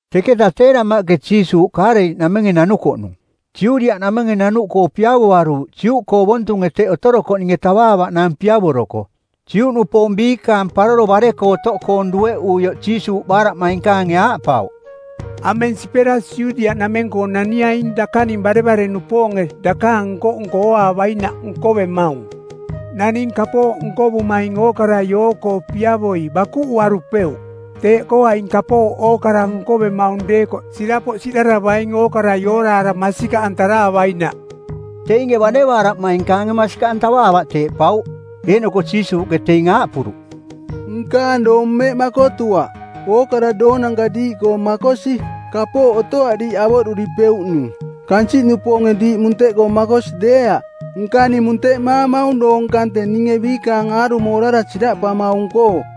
Teketa tee damaꞌke Jiisuuꞌ Kaaleliꞌnamenge nanukoꞌnung. Judiaꞌnamenge nanuꞌkoo piavoaruuꞌ Juꞌkoong ovontunge teꞌ otorokoꞌninge tavaavaꞌnaang piavoroko. Juꞌnupoong biikaang Paroro Bare-koo Otoꞌkoong dueꞌuioꞌ Jiisuuꞌ baaraꞌmainkaange aaꞌpauꞌ, “Ameng sipera Judiaꞌnameng-koo naniaing dakaning barevare-nupoonge dakaang nko-nko ooaavainaꞌ nkovemaung. Naning kapooꞌ nkovumaing ookarai oo-koo piavoi bakuꞌuarupeuꞌ. Teeꞌkoo aing kapooꞌ ookara nkovemaung deekoꞌ sirapoꞌ siꞌdaravaing ookarai ooraara masikaꞌantaraavainaꞌ.” Teinge bane baaraꞌmainkaange masikaꞌ antavaavaꞌ teeꞌpauꞌ. Eeꞌnoko Jiisuuꞌke teing aaꞌpuruꞌ, “Nkaang doong mmeꞌ makotuaꞌ. Ookara doonanka diiꞌkoo makosi. Kapooꞌ otoaꞌ diiꞌ avoꞌduripeuꞌnung. Kansiꞌnupoonge diiꞌ munteꞌkoo makosi deeaꞌ, nka ning munteꞌmaamaung doong kante ninge biikaang aarumo orara siraꞌpamaung-koo.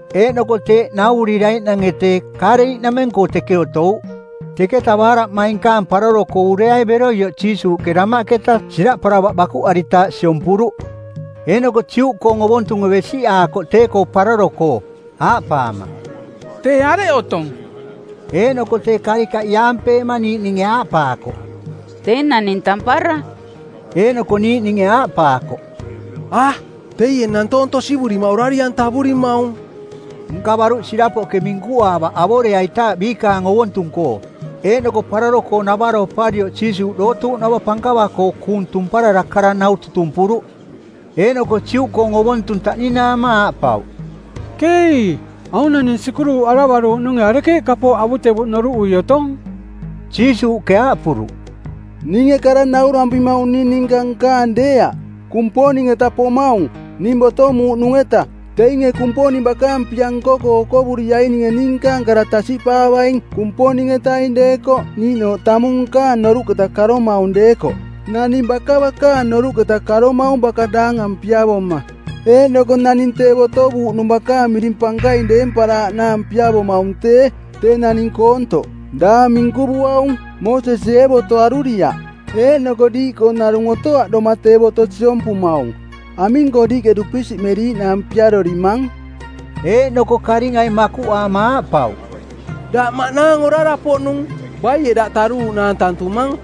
Eeꞌnoko teeꞌ nauvuriraiꞌnange tee, Kaaleliꞌnameng-koo teke otouꞌ. Teketa baaraꞌmainkaang paroro-koo ureai beroioꞌ Jiisuuꞌke damaꞌketa siraꞌparavaꞌ bakuꞌaritaaꞌ siompuruꞌ. Eeꞌnoko Juꞌkoong ovontunge besiꞌaakoꞌ tee-koo paroro-koo, aaꞌpaama, “Tee areꞌ otong?” Eeꞌnoko tee karikaꞌ iaampeema niiꞌninge aaꞌpaakoꞌ, “Tee naning tampara.” Eeꞌnoko niiꞌninge aaꞌpaakoꞌ, “A, teie nantoong tosivurima orari-antavurimaung.” Nka baruꞌ sirapoꞌke minkuaavarukoꞌ avoreaitaaꞌ biikaang ovontung-koo. Eeꞌnoko paroro-koo navaro oparioꞌ Jiisuuꞌ dootuuꞌnava pankava-koo kuung tumparara kara nau tutumpuruꞌ. Eeꞌnoko Juꞌkoong ovontung taꞌninaama aaꞌpauꞌ, “Keei. Aung naning sikuruꞌaravaruuꞌnunge arekeeꞌ kapooꞌ avutevuꞌ noruꞌui otong?” Jiisuuꞌke aaꞌpuruꞌ, “Ninge kara naurampimaung ning ninka nkaang deeaꞌ, Kumponing-eta pomaung, ning botomuuꞌnung-eta. Teinge Kumponing bakaang pia nko-koo okovuriainge ning nkaang kara tasiꞌpaavaing Kumponing-etaing deekoꞌ niiꞌnooꞌ tamung nkaang noruꞌketa karomaung deekoꞌ. Naning baka bakaang noruꞌketa karomaung baka daangang piavoma, eeꞌnoko naning tee botovuuꞌnung bakaang miring pankaing deemparaaꞌnaang piavomaung tee, tee naning koontoꞌ, daang minkuvuaung. Moosesie ee boto aruriaꞌ? Eeꞌnoko diiꞌkoo narung otoaꞌ doma tee boto siompumaung. Aming-koo diiꞌke dupisiꞌmeriiꞌnaang piarorimang?” Eeꞌnoko karingai makuꞌaama aaꞌpauꞌ, “Daꞌ maꞌnaang orara-poꞌnung. Baie daꞌ taruuꞌnaang tantumang?”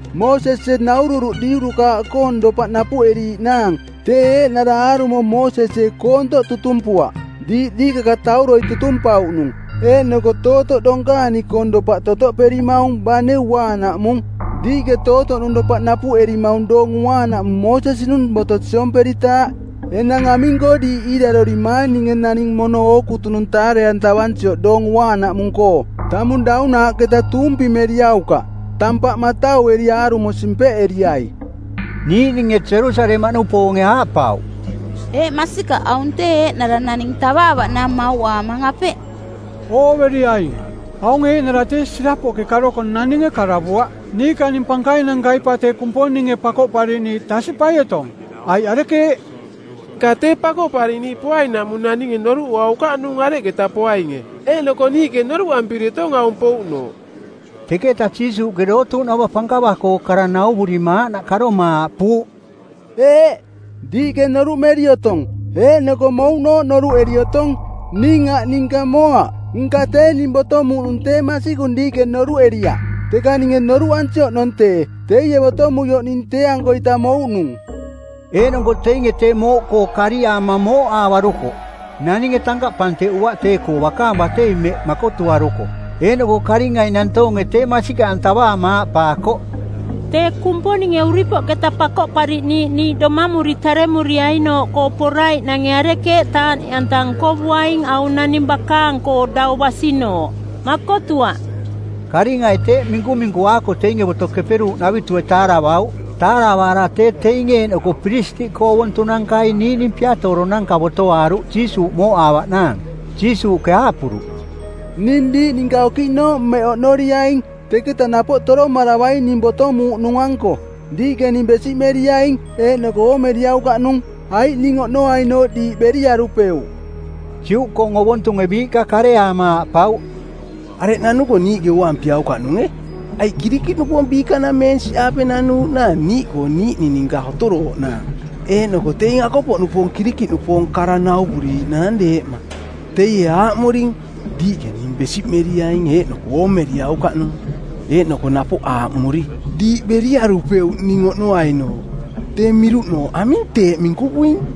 Moosesie naururuꞌ diurukaaꞌkoong dopaꞌ napuꞌeriiꞌnaang. Tee eeꞌnara aarumo Moosesie koontoꞌ tutumpuaꞌ, diiꞌ diikakatauroi tutumpauꞌnung, eeꞌnoko tootoꞌ donkaani-koong dopaꞌ totoꞌperimaung bane Uaanaꞌmung. Diiꞌke tootoꞌnung dopaꞌ napuꞌerimaung Doong Uaanaꞌmung Moosesi-nung boto siomperitaaꞌ. Enang aming-koo diiꞌ iirarorimaang ninge naning mono ookutunung taare-antavansioꞌ Doong Uaanaꞌmung-koo? Tamung daunaaꞌketa tuumpimeriaukaꞌ. Tampaꞌ mataueri aarumo simpeꞌeriai.” Niiꞌninge Jerusalemaꞌnupoonge aaꞌpauꞌ, “Eeꞌ, masikaꞌ, aung tee eeꞌnara naning tavaavaꞌnaang mauꞌaamang, apeꞌ? Ooveriaing, aung eeꞌnara tee sirapoꞌke karoko naninge karavuaꞌ. Niikaning pankainankai pa tee Kumponinge Pakoꞌpariꞌniiꞌ tasiꞌpai otong, aiꞌ arekeeꞌ? Nka tee Pakoꞌpariꞌniiꞌ poainaꞌmung naninge noruꞌuaukaꞌnung areketa poainge, eeꞌnoko niiꞌke noruꞌampiri otong aung pouꞌnooꞌ.” Teketa Jiisuuꞌke dootuuꞌnava pankava-koo kara nauvurima aaꞌnaꞌ karoma aaꞌpuuꞌ, “Eeꞌ, diiꞌke noruꞌmeri otong, eeꞌnoko mouꞌnooꞌ noruꞌeri otong. Ning aꞌ ninka moaꞌ. Nka tee ning botomuuꞌnung tee masikung diiꞌke noruꞌeriaꞌ. Teka ninge noruꞌansi oꞌnong tee, teie botomuioꞌ ning tee-ankoita mouꞌnung.” Eeꞌnoko teinge tee mooꞌkoo kariaama mooꞌaavarukoꞌ. Naninge tankaꞌ panteꞌuaꞌ tee-koo, bakaang batei mmeꞌ makotuaruko. Eeꞌnoko karingai nantoonge tee masikaꞌantavaama aaꞌpaakoꞌ, “Tee Kumponinge uripoꞌketa Pakoꞌpariꞌniiꞌ niiꞌ domamuri taremuriainooꞌkoo poraiꞌnange arekeeꞌ taaꞌniꞌanta nkovuaing aung naning bakaang-koo dau basinooꞌ? Makotuaꞌ.” Karingai teeꞌ minkuminkuaako teinge Boto Keperuuꞌnavitue taaravauꞌ. Taaravaara tee teinge eeꞌnoko piristiꞌkoong ovontunankai niiꞌning Piatooronanka botoaaruꞌ Jiisuuꞌ mooꞌaavaꞌnaang. Jiisuuꞌke aaꞌpuruꞌ, “Ning diiꞌ ninka okiꞌnooꞌ mmeꞌ oꞌnoriaing, teketa napoꞌ toromaravaing ning botomuuꞌnung-anko. Diiꞌke ning besiꞌmeriaing eeꞌnoko oomeriaukaꞌnung, aiꞌ ning oꞌnoainooꞌ diiꞌ beriarupeuꞌ.” Juꞌkoong ovontunge biiꞌka kareaama aaꞌpauꞌ, “Areꞌ nanuko niiꞌke ooampiaukaꞌnunge? Aiꞌ Kirikiꞌnupoong biikanameensiꞌaape nanuuꞌnaang niiꞌkoong niiꞌning ninka otorooꞌnaang, eeꞌnoko teing akopoꞌnupoong Kirikiꞌnupoong kara nauvuriiꞌnaang deeꞌma. Teie aaꞌmuring, ‘Diiꞌke ning besiꞌmeriaing eeꞌnoko oomeriaukaꞌnung.’ Eeꞌnoko napoꞌ aaꞌmuri, ‘Diiꞌ beriarupeuꞌ ning oꞌnoainooꞌ.’ Tee miruꞌnooꞌ aming teeꞌ minkuvuing?”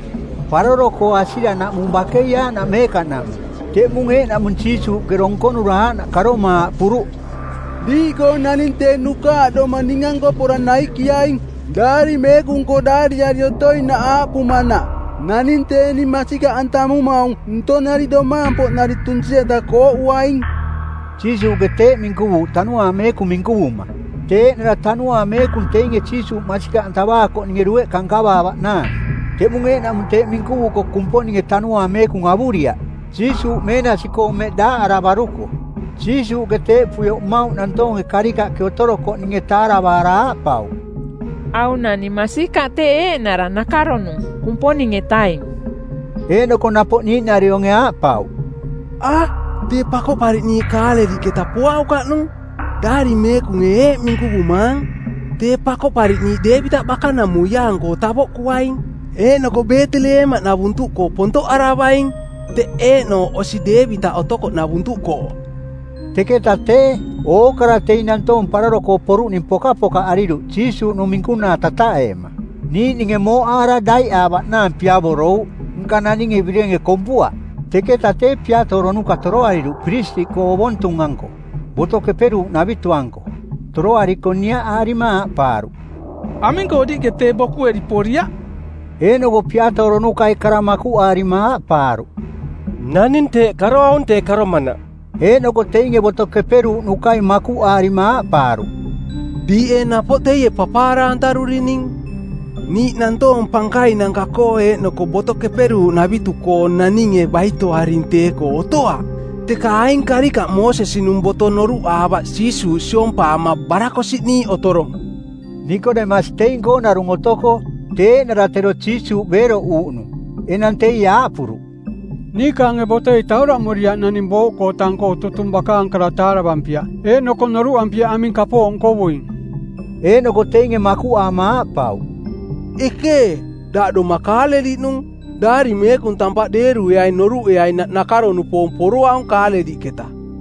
Paroro-koong asiranaꞌmung bakei aaꞌnaꞌ meekaꞌnaꞌmung. Teꞌmung eeꞌnaꞌmung Jiisuuꞌke donkonura aaꞌnaꞌ karoma aaꞌpuruꞌ, “Diiꞌkoong naning tee nukaaꞌdoma ning-anko pora naikiaing. Daari Meekung-koo daariari otoinaꞌ aaꞌpumanaꞌ, ‘Naning tee ning masikaꞌantamumaung ntonari domaang-poꞌnari tunsi-eta kooꞌuaing.’” Jiisuuꞌke teeꞌ minkuvuuꞌ Tanuaang Meekung minkuvuma. Tee eeꞌnara Tanuaang Meekung teinge Jiisuuꞌ masikaꞌantavaakoꞌninge dueꞌka nkavaavaꞌnaang. Teꞌmung eeꞌnaꞌmung teeꞌ minkuvuko Kumponinge Tanuaang Meekung avuriaꞌ, Jiisuuꞌ meenasi-koo mmeꞌ daaꞌaravaruko. Jiisuuꞌke teeꞌpuioꞌ mmauꞌ nantoonge karikaꞌke otorokoꞌninge taaravaara aaꞌpauꞌ, “Aung naning masikaꞌ tee eeꞌnara nakaronung Kumponing-etaing.” Eeꞌnoko napoꞌ niiꞌnarionge aaꞌpauꞌ, “A, tee Pakoꞌpariꞌniiꞌ Kaaleliꞌketa poaukaꞌnung. Daari Meekunge eeꞌ minkuvumaang: Tee Pakoꞌpariꞌniiꞌ Deevitaꞌ bakanamuiaang-koo tavoꞌkuaing, eeꞌnoko Beeteleemaꞌnavuntuꞌkoo pontoꞌaravaing, teꞌ eeꞌnooꞌ osi Deevitaꞌ otokoꞌnavuntuꞌkoo.” Teketa tee, ookara teing nantoong paroro-koo poruꞌning pokapokaꞌariruꞌ Jiisuuꞌnung minkunaa tataꞌeema. Niiꞌninge mooꞌaara daiꞌaavaꞌnaang piavorouꞌ, nka naninge birenge kompuaꞌ. Teketa tee Piatooronuka toroariruꞌ piristiꞌkoong ovontung-anko Boto Keperuuꞌnavitu-anko. Toroariko niaꞌaarima aaꞌpaaruꞌ, “Aming-koo diiꞌke tee bokueri poriaꞌ?” Eeꞌnoko piatooronukai kara makuꞌaarima aaꞌpaaruꞌ, “Naning teeꞌ karoaung tee karomanaꞌ.” Eeꞌnoko teinge Boto Keperuuꞌnukai makuꞌaarima aaꞌpaaruꞌ, “Diiꞌ ee napoꞌ teie papaara-antarurining? Niiꞌ nantoong pankainanka-koo eeꞌnoko Boto Keperuuꞌnavitu-koo naninge baitoaring tee-koo? Otoaꞌ. Teka aing karikaꞌ Moosesi-nung boto noruꞌaavaꞌ Jiisuuꞌ siompaama barakosiꞌniiꞌ otorong.” Nikodemasi teing-koong narung otoko, tee eeꞌnara tero Jiisuuꞌ beeroꞌuuꞌnung. Enang teie aaꞌpuruꞌ, “Niikaange botoi tauraꞌmuriaꞌ naning booꞌkoo tang-koo tutung kara bakaang taaravampiaꞌ eeꞌnoko noruꞌampiaꞌ aming kapooꞌ nkovuing.” Eeꞌnoko teinge makuꞌaama aaꞌpauꞌ, “Ekee, daꞌ doma Kaaleliꞌnung! Daari Meekung tampaꞌ deerueaing noruꞌeainaꞌ nakaro-nupoong poroaung Kaaleliꞌketa.”